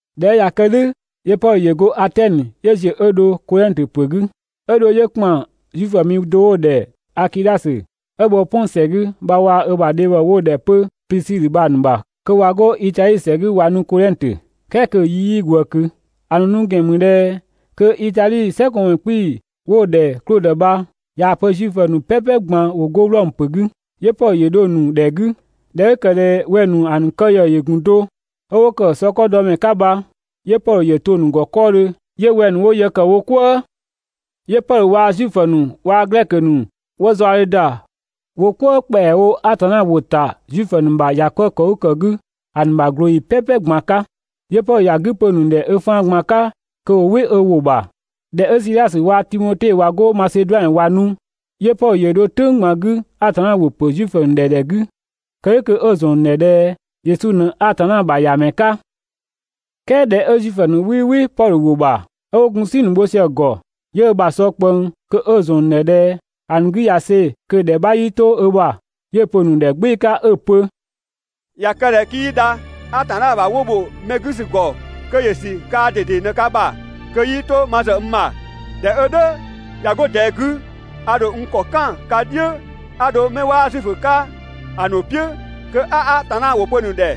꞊Dhɛ 'ö ꞊ya kë "dhʋ̈ 'yö Pɔdhö ‑yö go Atɛnö 'yö ‑ziö 'ö dho Kodhɛngtö ‑pö 'gü, 'ö dho 'yö ‑kpan Zuifö mi do 'wo‑ ‑dhɛ Akidhasö, 'ö bhɔ 'Pɔn ‑sɛ 'gü bha waa‑ ö ‑bha dhebhɔ 'wo‑ ‑dhɛ 'pö Plisidhö bha‑ ‑nu ‑bha kö ꞊wa 'go Itadhi ‑sɛ 'gü ꞊wa nu Kodhɛngtö, "kɛɛ kö‑ yi 'yii ꞊gwëë ꞊kö. ‑A ‑nu nu ‑gɛn ‑mü ꞊dhɛ kö Itadhi ‑sɛkɔɔnmɛ 'kpii‑ 'wo‑ ‑dhɛ Klodö bha ꞊yaa‑ pö Zuifö ‑nu "pɛpɛ ꞊gban ‑wo 'go Wlɔmö ‑pö 'gü. 'Yö Pɔdhö ‑yö dho‑ ‑nu ‑dhɛ 'gü. ꞊Dhɛ 'ö ‑kë ꞊dhɛ wɛng‑ ‑nu ‑a ‑nu kë ‑yë ‑yö ‑gun do, ('ö 'wo ‑kë sɔkɔdɔmɛ 'ka bha), 'yö Pɔdhö ‑yö to‑ ‑nu ‑gɔ 'kɔɔdhö 'yö wɛng‑ ‑nu 'wo yë ‑kë wo "kwëë. 'Yö Pɔdhö waa‑ Zuifö ‑nu waa‑ Glɛkö ‑nu 'wo zaɔdhe ‑da wo "kwëë ‑kpɛawo Atanna ‑wʋ ‑ta Zuifö ‑nu ‑bha ‑bhɔ "kwëë ‑kɔ 'gü ‑a ‑nu ‑bha ꞊glooyi "pɛpɛ ꞊gban 'ka. 'Yö Pɔdhö ‑ya 'gü pö‑ ‑nu ‑dhɛ ö faan ꞊gban 'ka kö ‑wo "wɩ ö ‑wʋ ‑bha. ꞊Dhɛ 'ö Sidhasö waa‑ Timote ꞊wa 'go Maseduanö ‑wa nu, 'yö Pɔdhö ‑yö dho "tʋ̈ng ꞊gban 'gü Atanna ‑wʋ ‑pö Zuifö ‑nu ‑dhɛ ‑dhɛ 'gü, kë "dhʋ̈ kö 'ö‑ ‑zɔn ‑nu ‑dhɛ ꞊dhɛ Yesu ꞊në Atanna ‑bha ‑Yamɛ 'ka. "Kɛɛ ꞊dhɛ 'ö Zuifö ‑nu 'wii "wɩ Pɔdhö ‑wʋ ‑bha, 'ö 'wo gun "si ‑nu bho sië‑ ‑gɔ, 'yö ö ‑bha ‑sɔ ꞊kpëng kö 'ö‑ ‑zɔn ‑a ‑nu ‑dhɛ ꞊dhɛ ‑a ‑nu 'gü ꞊ya see‑ kö‑ ‑dhɛ 'bha 'yii 'to ö ‑bha. 'Yö‑ pö‑ ‑nu ‑dhɛ "gbɩɩ‑ 'ka 'ö‑ pö: «꞊Ya kë ꞊dhɛ 'kii dha (Atanna ‑bha 'wɔn ‑bho mɛ 'gü ‑sü ‑gɔ) kö ‑yö ‑sü kaa ꞊dede ꞊në ka ‑bha kö 'yii 'to ma ‑zë n ‑bha. ꞊Dhɛ 'ö "dhʋ̈ ꞊ya 'go ꞊dɛɛ 'gü, a ‑dho n ‑kɔ "kan ka "dhiʋ̈ 'a dho 'mɛ 'waa Zuifö 'ka‑ ‑nu "piʋ̈ kö 'a Atanna ‑wʋ pö‑ ‑nu ‑dhɛ.»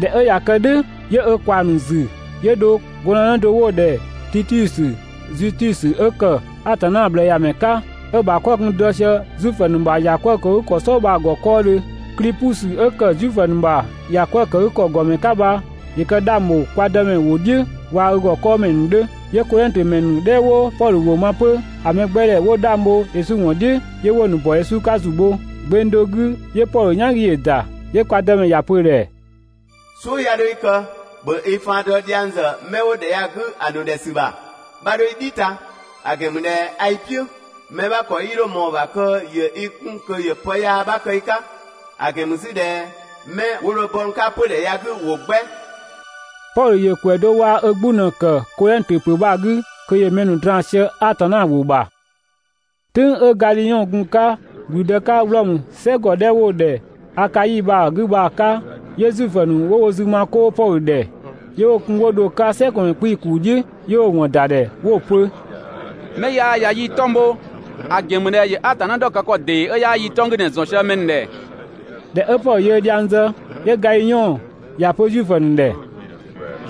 ꞊Dhɛ 'ö ꞊ya kë "dhʋ̈, 'yö ö ꞊kwaa‑ ‑nu ‑zü 'yö dho gɔndënë do 'wo‑ ‑dhɛ Titiusö Zutusö 'ö ‑kë Atanna ꞊bhlëëyamɛ 'ka, 'ö‑ ‑bha 'kɔ‑ gun dɔ sië Zuifö ‑nu ‑bha ‑bhɔ "kwëë ‑kɔ "sɔɔ bha‑ ‑gɔ 'kɔɔdhö. Klipusö 'ö ‑kë Zuifö ‑nu ‑bha ‑bhɔ "kwëë ‑kɔ ‑gɔmɛ 'ka bha ‑yö kë 'dhang ‑bho kwa Dëmɛ ‑wʋ "dhiʋ̈ waa‑ ö ‑gɔ 'kɔɔmɛ ‑nu 'dhö. 'Yö Kodhɛngtö ‑mɛ ‑nu 'dhɛ 'wo Pɔdhö ‑wʋ ma 'pö, ‑a mɛgbɛdhɛ 'wo 'dhang bho Yesu ‑wɔn "dhiʋ̈ 'yö 'wo‑ ‑nu ‑bɔ Yesu 'ka ‑zu bho. Gbeng do 'gü 'yö Pɔdhö "yan 'gü ‑yö ‑da, 'yö kwa Dëmɛ ‑ya pö‑ ‑dhɛ: «"Suʋ̈ 'ya 'dho i kë! ‑Bhö i faan dɔ dhiang ‑zë 'mɛ 'wo ‑dhɛ ya‑ 'gü ‑a ‑nu ‑dhɛ ‑sü ‑bha, 'bha 'dho i "dhi ta, ‑a ‑gɛn ‑mü ꞊dhɛ a i "piʋ̈. Mɛ 'bha ‑kɔ 'yii 'dho ꞊mɔɔ‑ ‑bha kö ‑yö i 'kun kö ‑yö pë yaa 'bha kë i 'ka; ‑a ‑gɛn ‑mü 'zü ꞊dhɛ 'mɛ 'wo dho bɔ n 'ka 'pödhɛ ya‑ 'gü ‑wo 'gbɛ!» Pɔdhö ‑yö ‑kwɛ do waa‑ ö 'gbu ꞊në‑ ‑kë Kodhɛngtö ‑pö bha‑ 'gü kö ‑yö mɛ ‑nu draan‑ sië Atanna ‑wʋ ‑bha. "Tʋ̈ng 'ö Gadhiɔn‑ gun‑ 'ka ‑gblüdë 'ka Wlɔmö "sɛ ‑gɔ 'dhɛ 'wo‑ ‑dhɛ Akai bha‑ 'gü bha‑ 'ka, 'yö Zuifö ‑nu 'wo wo zü ma 'koo Pɔdhö ‑dhɛ, 'yö 'wo‑ kun 'wo dho‑ 'ka "sɛgɔdhiʋ̈mɛ ‑kuu "dhiʋ̈ 'yö 'wo‑ 'wɔn ‑da ‑dhɛ, 'wo‑ pö‑: «'Mɛ ya ꞊ya yii‑ 'tɔng‑ bho, ‑a ‑gɛn ‑mü ꞊dhɛ ‑yö Atanna ‑dhɔkë ‑kɔ ‑dee 'ö 'yaa yii‑ 'tɔng‑ 'gü ꞊në‑ ‑zɔn sië mɛ ‑nu ‑dhɛ!» ꞊Dhɛ 'ö Pɔdhö yöö dhiang zë, 'yö Gadhiɔn ‑ya pö Zuifö ‑nu ‑dhɛ: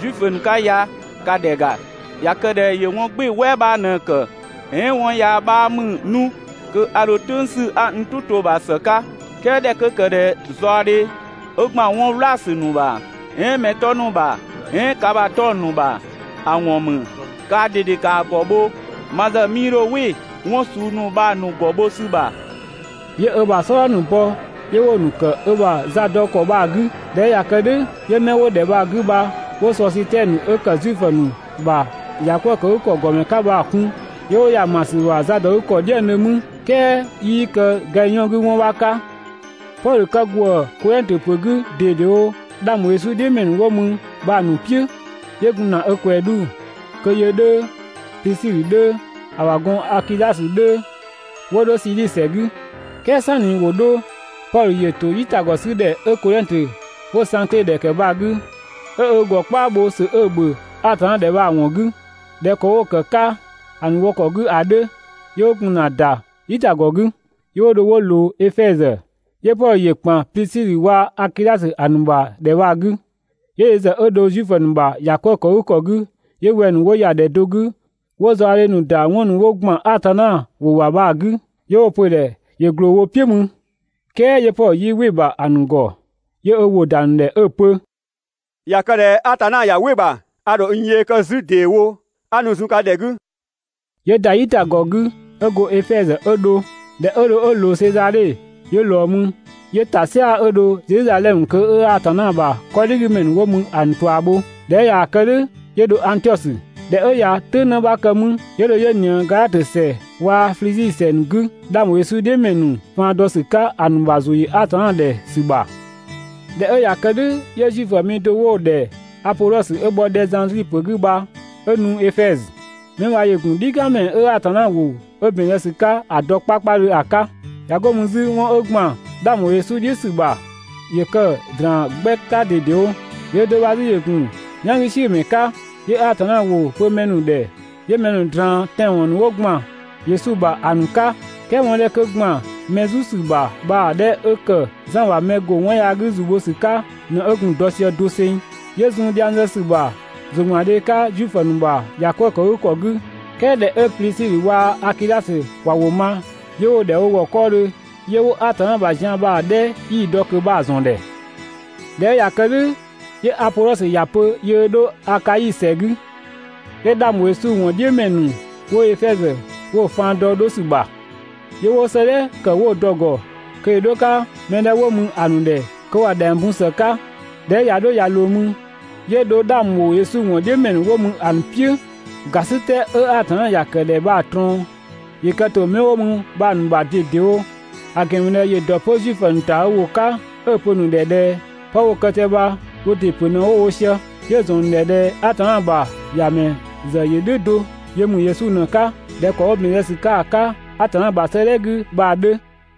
«Zuifö ‑nu 'ka ya, ‑Ka ‑dhɛ ‑ga! ꞊Ya kë ꞊dhɛ 'mɛ 'ö ya ‑yö 'wɔn "gbɩɩ‑ "wɛɛ 'bha ꞊në‑ ‑kë, "ɛɛn 'wɔn yaa 'bha ‑mü 'nu, kö a ‑dho "tʋ̈ng 'sü 'a n "tʋ to‑ ‑bha ‑së 'ka, "kɛɛ ꞊dhɛ 'kö ‑kë ꞊dhɛ zaɔdhe 'ö ‑gban ‑wʋ "wlaasü ‑nu ‑bha, "ɛɛn mɛ 'tɔ ‑nu ‑bha, "ɛɛn ka ‑bha 'tɔng‑ ‑nu ‑bha ‑a ‑wɔn ‑mü bha, kaa ꞊dede ‑kaa ‑gɔ bho. Ma ‑zë 'mii 'dho "wɩ 'wɔn suu ‑nu bha‑ ‑nu ‑gɔ bho ‑sü ‑bha!» 'Yö ö ‑bha "sɔdha ‑nu bɔ 'yö 'wo‑ ‑nu ‑kë ö ‑bha zadɔkɔ bha‑ 'gü. ꞊Dhɛ 'ö ꞊ya kë "dhʋ̈, 'yö 'mɛ 'wo ‑dhɛ bha‑ 'gü bha 'wo Sɔsitɛnö 'ö ‑kë Zuifö ‑nu ‑bha ‑yakwëëkëgükɔ ‑gɔmɛ 'ka bha‑ kun, 'yö 'wo ‑ya ‑ma ‑sü ‑bha zadɔgükɔ "dhiëngdhö mü, "kɛɛ 'yii kë Gadhiɔn 'gü 'wɔn 'bha 'ka. Pɔdhö kë ‑gwëë Kodhɛngtö ‑pö 'gü ꞊dedewo 'dhang ‑bho Yesu "dhiʋ̈ ‑mɛ ‑nu 'wo mü bha‑ ‑nu "piʋ̈, 'yö gun ‑na 'ö ꞊kwɛɛ 'dhu kö yö 'dhö, Plisidhö 'dhö, (‑a ‑bha gɔn) Akidhasö 'dhö 'wo dho Siidhi ‑sɛ 'gü. "Kɛɛ "sanni ‑wo 'dho, Pɔdhö ‑yö ‑to "yitagɔ 'sü ‑dhɛ 'ö Kodhɛngtö, 'wo‑ Sangkle ‑dhɛ ‑kë bha‑ 'gü 'ö ö ‑gɔ "kpaa bho ‑sö 'ö‑ ‑bhö Atanna ‑dhɛ bha‑ ‑wɔn 'gü (꞊dhɛ ‑kɔ 'wo‑ ‑kë 'ka ‑a ‑nu wɔ ‑kɔ 'gü ‑a 'dhö), 'yö 'wo gun ‑na ‑da "yitagɔ 'gü. 'Yö 'wo dho 'wo ꞊loo Efɛzö, 'yö Pɔdhö ‑yö ‑kan Plisidhö waa‑ Akidhasö ‑a ‑nu ‑bha ‑dhɛ bha‑ 'gü. 'Yö yö ‑zë 'ö dho Zuifö ‑nu ‑bha ‑bhɔ "kwëë ‑kɔ 'gü, 'yö wɛng‑ ‑nu 'wo ‑ya ‑dhɛ do 'gü 'wo zaɔdhe ‑nu ‑da 'wɔn ‑nu 'wo ‑gban Atanna ‑wʋ ‑bha bha‑ 'gü. 'Yö 'wo‑ pö‑ ‑dhɛ ‑yö ꞊gloo wo "piʋ̈ mü, "kɛɛ 'yö Pɔdhö 'yii "wɩ‑ ‑bha ‑a ‑nu ‑gɔ. 'Yö ö ‑wʋ ‑da ‑nu ‑dhɛ 'ö‑ pö: «꞊Ya kë ꞊dhɛ Atanna ꞊ya "wɩ‑ ‑bha a ‑dho n yee kë 'zü ‑deewo 'a nu zun ka ‑dhɛ 'gü.» 'Yö ‑da "yitagɔ 'gü 'ö go Efɛzö 'ö dho. ꞊Dhɛ 'ö dho 'ö ꞊loo Sezadhe, 'yö ꞊lɔɔ mü, 'yö ‑ta "sia‑ 'ö dho Zedhizadhɛmö kö 'ö Atanna ‑bha 'kɔdhigümɛ ‑nu 'wo mü ‑a ‑nu ꞊tua bho. ꞊Dhɛ 'ö ꞊yaa‑ kë "dhʋ̈, 'yö dho Angtiɔsö. ꞊Dhɛ 'ö ꞊ya "tʋ̈ng 'në 'bha kë mü, 'yö dho 'yö ꞊nië Gadhatö ‑sɛ waa‑ Flizi ‑sɛ ‑nu 'gü, 'dhang ‑bho Yesu "dhiʋ̈ ‑mɛ ‑nu faan dɔ ‑sü 'ka ‑a ‑nu ‑bha ‑zʋ ‑yö Atanna ‑dhɛ ‑sü ‑bha. ꞊Dhɛ 'ö ꞊ya kë "dhʋ̈ 'yö Zuifö mi do 'wo‑ ‑dhɛ Apodhɔsö 'ö bhɔ Dhɛzandri ‑pö 'gü bha 'ö ‑nu Efɛzö. 'Mɛ bha ‑yö ‑gun "dhikanmɛ 'ö Atanna ‑wʋ 'ö ‑bɛn zë ‑sü 'ka ‑a dɔ 'kpakpadhö ‑a 'ka. ꞊Ya go mü 'zü 'wɔn 'ö ‑gban 'dhang ‑bho Yesu "dhiʋ̈ ‑sü ‑bha, ‑yö kë‑ ꞊draan 'gbɛ 'ka ꞊dedewo. Yöö do bha 'zü ‑yö ‑gun "yangüsiʋ̈mɛ 'ka, 'yö Atanna ‑wʋ pö mɛ ‑nu ‑dhɛ 'yö mɛ ‑nu ꞊draan tɛanwɔn ‑nu 'wo ‑gban Yesu ‑bha ‑a ‑nu 'ka, "kɛɛ 'wɔn 'dhɛ 'kö ‑gban mɛ "zu ‑sü ‑bha bha‑ 'dhɛ 'ö ‑kë Zan ‑bha mɛ ‑go 'wɔn yaa 'gü ‑zu bho ‑sü 'ka ꞊në 'ö gun‑ dɔ sië doseng. 'Yö zun dhiang zë ‑sü ‑bha ‑zʋgbandhe 'ka Zuifö ‑nu ‑bha ‑yakwëëkëgükɔ 'gü. "Kɛɛ ꞊dhɛ 'ö Plisidhö waa‑ Akidhasö ‑wa ‑wʋ ma, 'yö 'wo‑ ‑dhɛ wo ‑gɔ 'kɔɔdhö 'yö 'wo Atanna ‑bha zian bha‑ 'dhɛ 'yii‑ dɔ ꞊kö bha‑ ‑zɔn ‑dhɛ. ꞊Dhɛ 'ö ꞊ya kë "dhʋ̈, 'yö Apodhɔsö ‑ya pö yöö 'dho Akai ‑sɛ 'gü, 'yö 'dhang ‑bho Yesu ‑wɔn "dhiʋ̈ ‑mɛ ‑nu 'wo Efɛzö 'wo‑ faan dɔ 'dho ‑sü ‑bha, 'yö 'wo 'sëëdhɛ ‑kë 'wo‑ dɔ‑ ‑gɔ kö ‑yö 'dho‑ 'ka mɛ 'dhɛ 'wo mü ‑a ‑nu ‑dhɛ kö ‑wa ‑dhɛng bun ‑së 'ka. ꞊Dhɛ 'ö ꞊ya 'dho ꞊ya ꞊loo mü, 'yö dho 'dhang ‑bho Yesu ‑wɔn "dhiʋ̈ ‑mɛ ‑nu 'wo mü ‑a ‑nu "piʋ̈, ‑gasitɛ 'ö Atanna ‑ya ‑kë ‑dhɛ bha‑ ꞊trɔɔn ‑yö kë ‑to 'mɛ 'wo mü bha‑ ‑nu ‑bha ꞊dedewo; ‑a ‑gɛn ‑mü ꞊dhɛ ‑yö ‑dɔ 'pö Zuifö ‑nu ‑ta ö ‑wʋ 'ka 'ö‑ pö‑ ‑nu ‑dhɛ ꞊dhɛ 'pë 'wo‑ kë sië bha wo ‑dɩ ‑pö ꞊në 'wo‑ wo sië, 'yö‑ ‑zɔn ‑nu ‑dhɛ ꞊dhɛ Atanna ‑bha ‑Yamɛ ‑zë ‑yö "dhʋ̈ do, yö ‑mü Yesu ꞊në‑ 'ka ꞊dhɛ ‑kɔ 'ö ‑bɛn zë ‑sü 'ka‑ 'ka Atanna ‑bha 'sëëdhɛ 'gü bha‑ 'dhö.